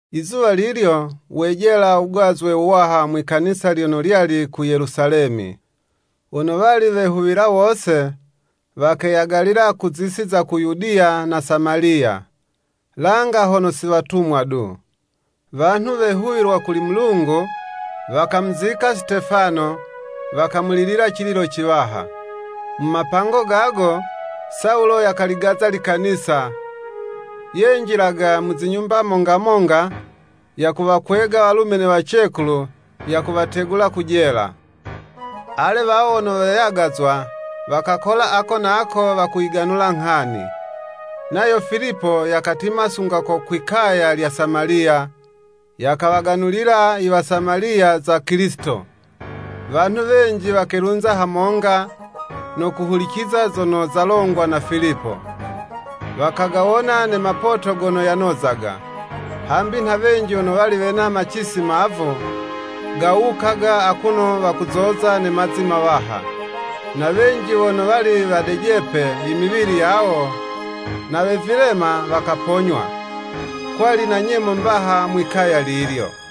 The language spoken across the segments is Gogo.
Izuwa lilyo wejela wugazwe wuwaha mwi'kanisa lyono lyali ku Yelusalemi. Wono wali wehuwila wose, wakeyagalila ku zisi za Yudiya na Samaliya, langa hono si watumwa du. Wanhu wehuwilwa kuli Mulungu, wakamuzika Sitefano, wakamulilila cililo ciwaha. Mu mapango gago, Sawulo yakaligaza likanisa, yenjilaga mu zinyumba monga monga, yakuwakwega walume ne wacekulu, yakuwategula ku jela. Ale, wawo wono weyagazwa, wakakola ako na ako wakuyiganula nghani. Nayo Filipo yakatima sunga ko kwi 'kaya lya Samaliya, yakawaganulila Iwasamaliya za Kilisito. Wanhu wenji wakelunza hamonga, no kuhuliciza zono zalongwa na Filipo, wakagawona ne mapoto gono yanozaga. Hambi nha wenji wono wali wena macisi mavu, gawukaga akuno wakuzoza ne mazi mawaha. Na wenji wono wali wadejepe imiwili yawo na we vilema, wakaponywa. Kwali na nyemo mbaha mwi'kaya lilyo.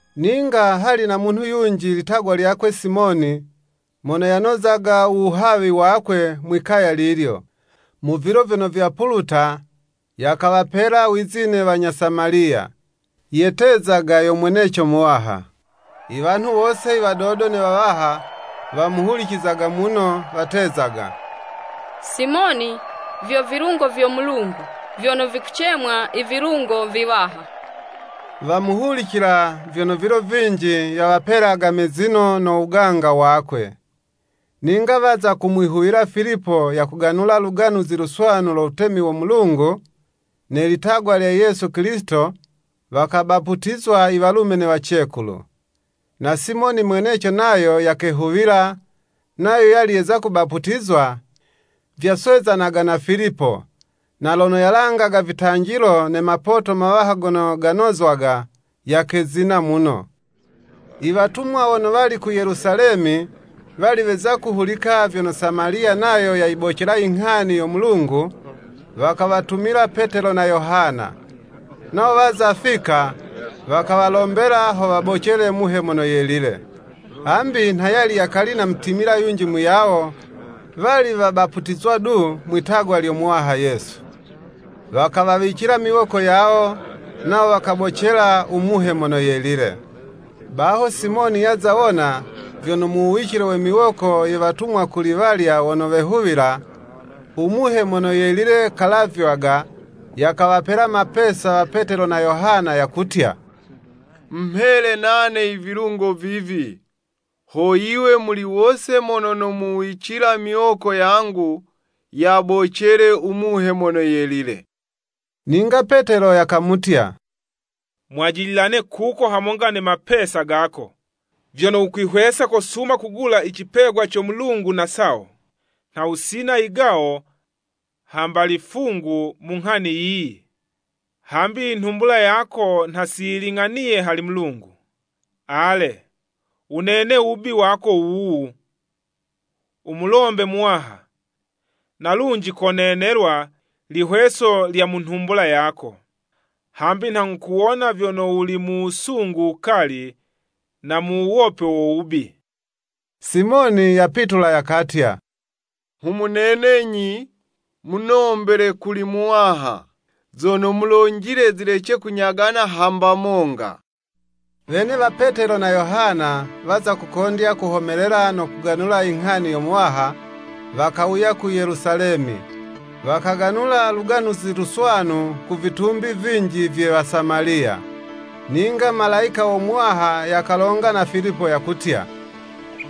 Ninga hali na munhu yunji litagwa lyakwe Simoni, mono yanozaga u wuhawi wakwe mwi'kaya lilyo, mu vilo vyono vyapuluta, yakawapela wizine wanya Samaliya, yetezaga yo mweneco muwaha. Iwanhu wose iwadodo ne wawaha, wamuhulicizaga muno, watezaga, “Simoni vyo vilungo vyo Mulungu, vyono vikucemwa Ivilungo viwaha.” Wamuhulicila, vyono vilo vinji yawapelaga mezino no wuganga wakwe. Ninga waza kumwihuwila Filipo yakuganula Luganuzi Luswanu lo wutemi wo Mulungu, ne litagwa lya Yesu Kilisito, wakabaputizwa iwalume ne wacekulu. Na Simoni mweneco nayo yakehuwila, nayo yali yeza kubaputizwa, vyaswezanaga na Filipo, na lono yalangaga vitanjilo ne mapoto mawaha gono ganozwaga, yakezina muno. Iwatumwa wono wali ku Yelusalemi, wali weza kuhulika vyono Samaliya nayo yayibocela inghani yo Mulungu, wakawatumila Petelo na Yohana. Nawo waza fika, wakawalombela ho wabocele Muhe Mono Yelile. Hambi nha yali yakali namutimila yunji muyawo, wali wabaputizwa du, Mwi'tagwa lyo Muwaha Yesu. Wakawawicila miwoko yawo, nawo wakabocela u Muhe Mono Yelile. Baho Simoni yaza wona, vyono mu wuwicile we miwoko ye Watumwa kuli walya wono wehuwila, u Muhe Mono Yelile kalavywaga, yakawapela mapesa wa Petelo na Yohana, yakutya, “Mumhele nane ivilungo vivi, ho yiwe muli wose mono nomuwicila miwoko yangu, yabocele u Muhe Mono Yelile.” Ninga Petelo yakamutya, “Mwajililane kuko hamonga ne mapesa gako, vyono wukwihwesa kosuma kugula i cipegwa co Mulungu na sawo. Nha wusina yigawo hamba lifungu mu nghani yiyi, hambi inhumbula yako nha si yiling'aniye hali Mulungu. Ale wunene wubi wako wuwu, wumulombe Muwaha, na lunji konenelwa lihweso lya mu nhumbula yako. Hambi nha nghukuwona vyono wuli mu wusungu wukali, na mu wuwopwe wo wubi.” Simoni yapitula yakatya, “Nghumunenenyi, munombele kuli Muwaha, zono mulonjile zilece kunyagana hamba monga.” Wene wa Petelo na Yohana waza kukondya kuhomelela no kuganula inghani yo Muwaha, wakawuya ku Yelusalemi, wakaganula Luganuzi Luswanu ku vitumbi vinji vye Wasamaliya. Ninga Malayika wo Muwaha yakalonga na Filipo yakutya,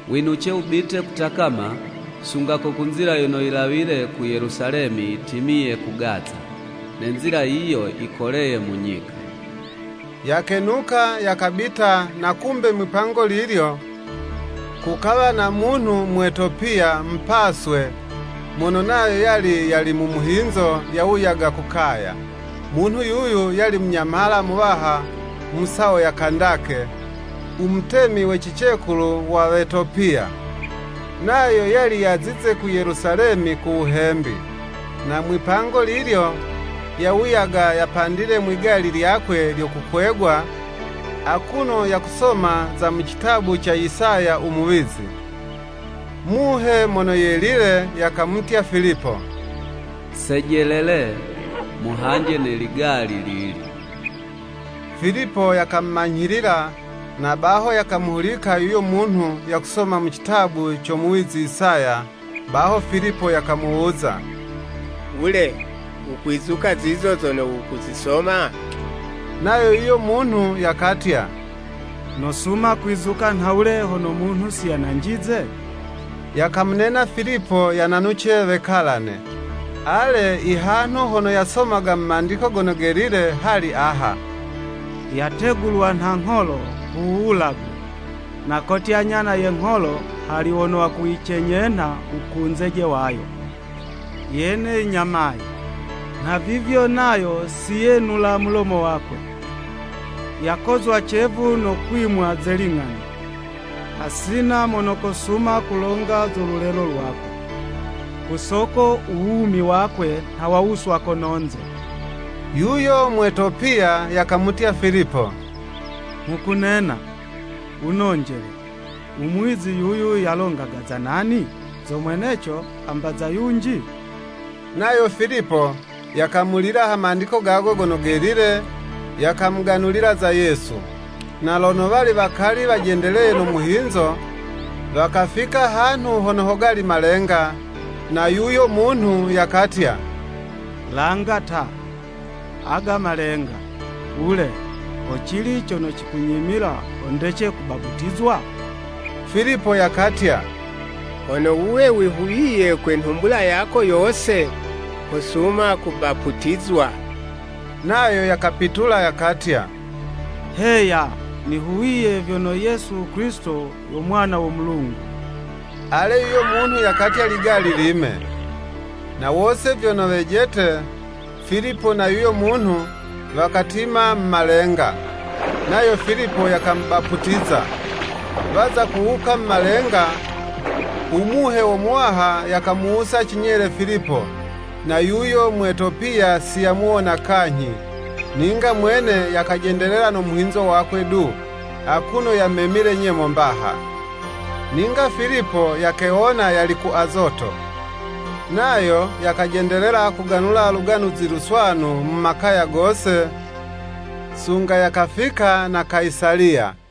“Winuce wubite kutakama sunga ko ku nzila yono yilawile ku Yelusalemi yitimiye ku Gaza.” (Ne nzila yiyo yikoleye mu nyika.) Yakenuka, yakabita, na kumbe mwi'pango lilyo, kukawa na munhu Mwetopiya, mupaswe, mono nayo yali yali mu muhinzo yawuyaga ku kaya. Munhu yuyu yali munyamhala muwaha mu sawo ya Kandake, u Mutemi we cicekulu wa Wetopiya. Nayo yali yazize ku Yelusalemi ku wuhembi. Na mwi'pango lilyo, yawuyaga yapandile mwi'gali lyakwe lyo kukwegwa, akuno yakusoma za mu citabu ca Isaya u Muwizi. Muhe Mono Yelile yakamutya Filipo, “Sejelele, muhanje ne ligali lili.” Filipo yakamumanyhilila, na baho, yakamuhulika yuyo munhu yakusoma mu citabu co muwizi Isaya, baho Filipo yakamuwuza, “Wule wukwizuka zizo zono wukuzisoma?” Nayo yuyo munhu yakatya, “Nosuma kwizuka nhawule hono munhu si yananjize?” Yakamunena Filipo yananuce wekalane. Ale, ihanhu hono yasomaga mu Mandiko Gono Gelile, hali aha, “Yategulwa nha ngholo ku wuwulagwe. Na kotya nyana ye ngholo hali wono wakuyicenyenha wukunzeje wayo, yene yinyamaye. Nha vivyo nayo siyenula mulomo wakwe. Yakozwa cevu no kwimwa ze ling'ani. Hasina mono kosuma kulonga zo lulelo lwakwe, ku soko u wumi wakwe, nha wawuswa kono'nze.” Yuyo Mwetopiya yakamutya Filipo, “Nghukunena, wunonjele, umuwizi yuyu yalongaga za nani?” Zo mweneco, hamba za yunji? Nayo Filipo yakamulila ha Mandiko gago Gono Gelile, yakamuganulila za Yesu. Na lono wali wakali wajendeleye no muhinzo, wakafika hanhu hono hogali malenga, na yuyo munhu yakatya, “Langa ta, aga malenga, wule ho cili cono cikunyimila ho ndece kubaputizwa?” [ Filipo yakatya, “Hono wuwe wihuwiye kwe nhumbula yako yose, kosuma kubaputizwa.” Nayo yakapitula yakatya, “Heya nihuwiye vyono Yesu Kilisito yo Mwana wo Mulungu.”] Ale yuyo munhu yakatya ligali lime. Na wose vyono wejete, Filipo na yuyo munhu, wakatima mu malenga. Nayo Filipo yakamubaputiza. Waza kuwuka mu malenga, u Muhe wo Muwaha yakamuwusa cinyele Filipo, na yuyo Mwetopiya si yamuwona kanyhi, ninga mwene yakajendelela no muhinzo wakwe du, akuno yamemile nyemo mbaha. Ninga Filipo yakewona yali ku Azoto. Nayo yakajendelela kuganula Luganuzi Luswanu mu makaya gose, sunga yakafika na Kayisaliya.